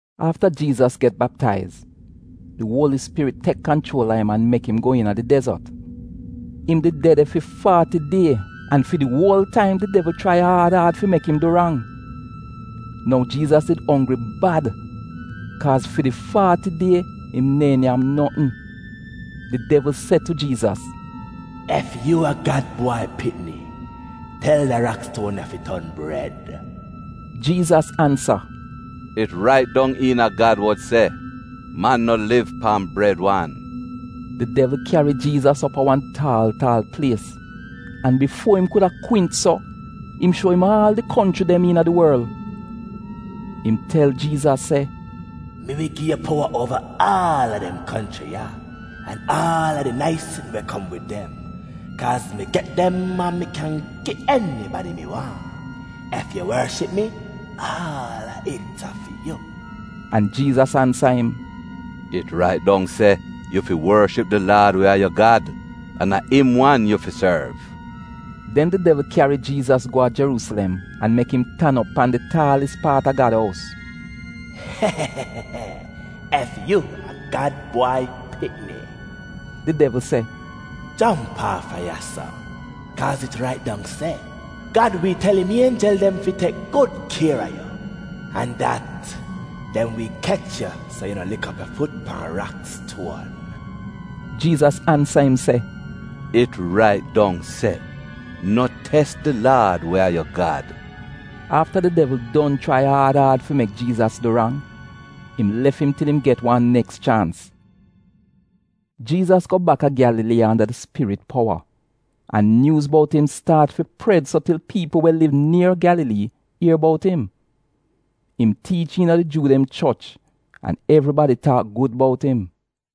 Afta Jiizas get baptaiz, di Uoli Spirit tek kanchuol a im an mek im go iina di dezot. Im did de de fi faati die an fi di uol taim, di devl chrai aad aad fi mek im du rang. Nou, Jiizas did onggri bad kaaz fi di faati die im neehn nyam notn. Di devl se tu Jiizas, “Ef yu a Gad Bwai Pikni, tel da rakstuon ya fi ton bred.” Jiizas ansa, “It rait dong iina Gad wod se, ‘Man no liv pan bred wan.’” Di devl kyari Jiizas op a wan taal taal plies an bifuo im kuda kwint so, im shuo im aal di konchri dem iina di worl. Im tel Jiizas se, “Mi wi gi yu powa uova aal a dem konchri ya an aal a di nais sitn we kom wid dem, kaaz mi get dem an mi kyan gi enibadi mi waahn. Ef yu worship mi, aal a it a fi yu.” An Jiizas ansa im, “It rait dong se, ‘Yu fi worship di Laad we a yu Gad, an a im wan yu fi sorv.’” Den di devl kyari Jiizas go a Jeruusilem an mek im tan op pan di taalis paat a Gad ous. “Ef yu a Gad Bwai Pikni,” di devl se, “jomp aafa ya-so. Kaaz it rait dong se, ‘Gad wi tel im ienjel dem fi tek gud kier a yu,’ an dat ‘dem wi kech yu, so yu no lik op yu fut pan rakstuon.’” Jiizas ansa im se, “It rait dong se, ‘No tes di Laad we a yu Gad.’” Afta di devl don chrai aad aad fi mek Jiizas du rang, im lef im til im get wan neks chaans. Jiizas go baka Gyalalii anda di Spirit powa, an nyuuz bout im staat fi pred so til piipl we liv nier Gyalalii ier bout im. Im tiich iina di Juu dem choch, an evribadi taak gud bout im.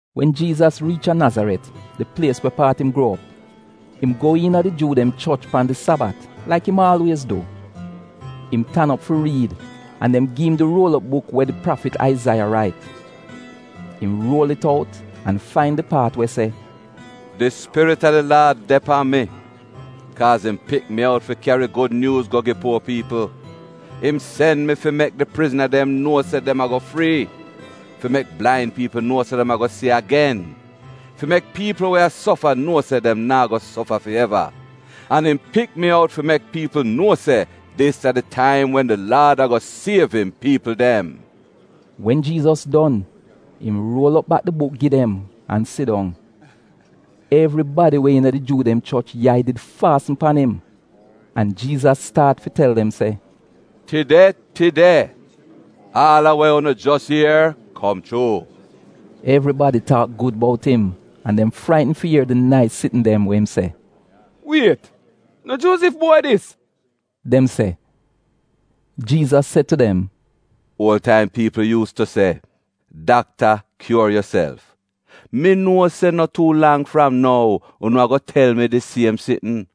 Wen Jiizas riich a Nazaret, di plies we paat im gruo op, im go iina di Juu dem choch pan di Sabat, laik im aalwiez du. Im tan op fi riid an dem gi im di ruol op buk we di prafit Aizaiya rait. Im ruol it out an fain di paat we se: “Di Spirit a di Laad de pan mi, kaaz im pik mi out fi kyari gud nyuuz go gi puo piipl. Im sen mi fi mek di prizna dem nuo se dem ago frii, fi mek blain piipl nuo se dem ago si agen, fi mek piipl we a sofa nuo se dem naa go sofa fi eva. An im pik mi out fi mek piipl nuo se dis a di taim wen di Laad ago siev im piipl dem.” Wen Jiizas don, im ruol op bak di buk gi dem an sidong. Evribadi we iina di Juu dem choch yai did faasn pan im, an Jiizas staat fi tel dem se, “Tide tide, aal a we unu jos ier, kom chuu.” Evribadi taak gud bout im an dem fraitn fi ier di nais sitn dem we im se. “Wiet! No Juozif bwai dis?” dem se. Jiizas se tu dem, “Uol taim piipl yuus tu se, ‘Dakta, kyuor yuself.’ Mi nuo se no tuu lang fram nou unu ago tel mi di siem sitn.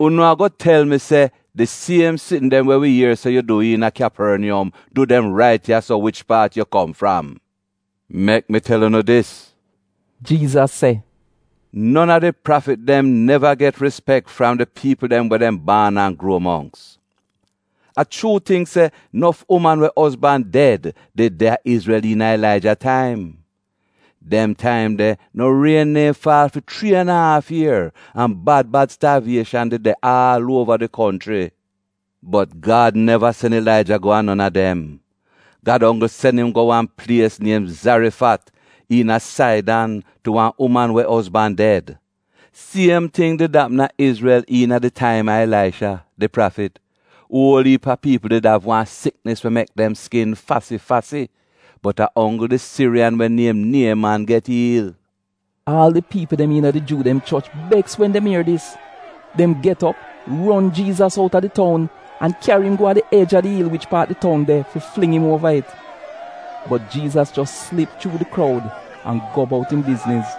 Unu ago tel mi se ‘Di siem sitn dem we wi ier se yu du iina Kyaporniyom du dem rait ya-so wich paat yu kom fram.’” “Mek mi tel unu dis.” Jiizas se, “Non a di prafit dem neva get rispek fram di piipl dem we dem baan an gruo mongks. A chuu ting se, nof uman we ozban ded did de a Izrel iina Ilaija taim. Den taim de no rien neehn faal fi chrii an a aaf ier an bad bad staavieshan did de aal uova di konchri. Bot Gad neva sen Ilaija go a non a dem. Gad onggl sen im go wan plies niem Zarifat iina Saidan tu wan uman we ozban ded. Siem ting did apm a Izrel iina di taim a Ilaisha, di prafit. Uol iip a piipl did av wan siknis we mek dem skin fasi-fasi, bot a onggl di Siriyan we niem Nieman get iil.” Aal di piipl dem iina di Juu dem choch beks wen dem ier dis. Dem get op, ron Jiizas outa di toun, an kyari im go a di ej a di il wich paat di toun de fi fling im uova it. Bot Jiizas jos slip chuu di kroud an go bout im bizniz.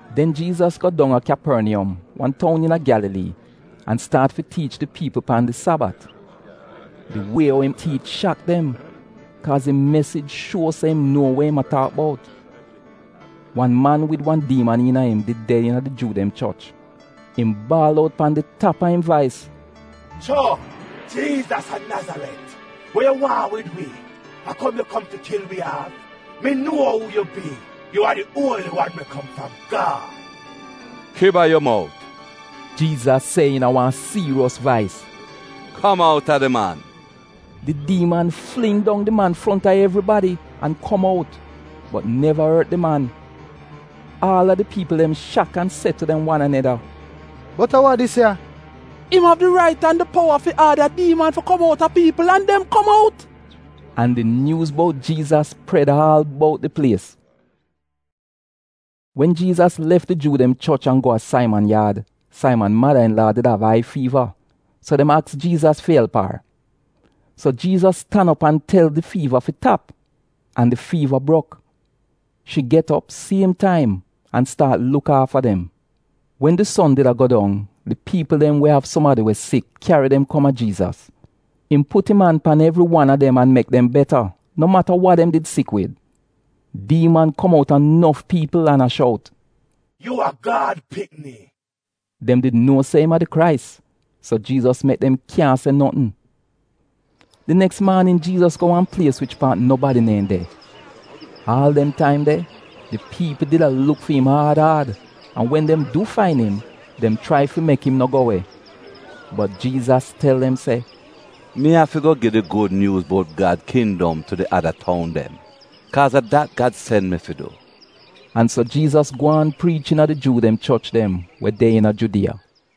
Den Jiizas go dong a Kyaporniyom, wan toun iina Gyalalii, an staat fi tiich di piipl pan di Sabat. Di wie ou im tiich shak dem, kaaz im mesij shuo se im nuo we im a taak bout. Wan man wid wan diiman iina im, did de iina di Juu dem choch. Im baal out pan di tap a im vais. “Cho! Jiizas a Nazaret we yu waahn wid wi? A kom yu kom fi kil wi aaf? Mi nuo uu yu bi. Yu a di Uoli Wan we kom fram Gad!” “Kiba yu mout!” Jiizas se iina wan siiriyos vais. “Kom outa di man!” Di diiman fling dong di man fronta evribadi an kom out bot neva ort di man. Aal a di piipl dem shak an se tu dem wan aneda, “Bot a wa dis ya? Im av di rait an di powa fi aada diiman fi kom out a piipl an dem kom out!” An di nyuuz bout Jiizas pred aal bout di plies. Wen Jiizas lef di Juu dem choch an go a Saiman yaad, Saiman mada-in-laa did av ai fiiva, so dem aks Jiizas fi elp ar. So Jiizas tan op an tel di fiiva fi tap, an di fiiva brok. Shi get op siem taim an staat luk aafa dem. Wen di son did a go dong, di piipl dem we av sumadi we sik, kyari dem kom a Jiizas. Im put im an pan evri wan a dem an mek dem beta, no mata wa dem did sik wid. Diiman kom outa nof piipl an a shout, “Yu a Gad pikni!” Dem did nuo se im a di Krais, so Jiizas mek dem kyaahn se notn. Di neks maanin Jiizas go wan plies wich paat nobadi neehn de. Aal dem taim de, di piipl did a luk fi im aad aad an wen dem du fain im, dem chrai fi mek im no go we. Bot Jiizas tel dem se, “Mi afi go gi di gud nyuuz bout Gad kindom tu di ada toun dem, kaaz a dat Gad sen mi fi du.” An so Jiizas gwaan priich iina di Juu dem choch dem we de iina Judiya.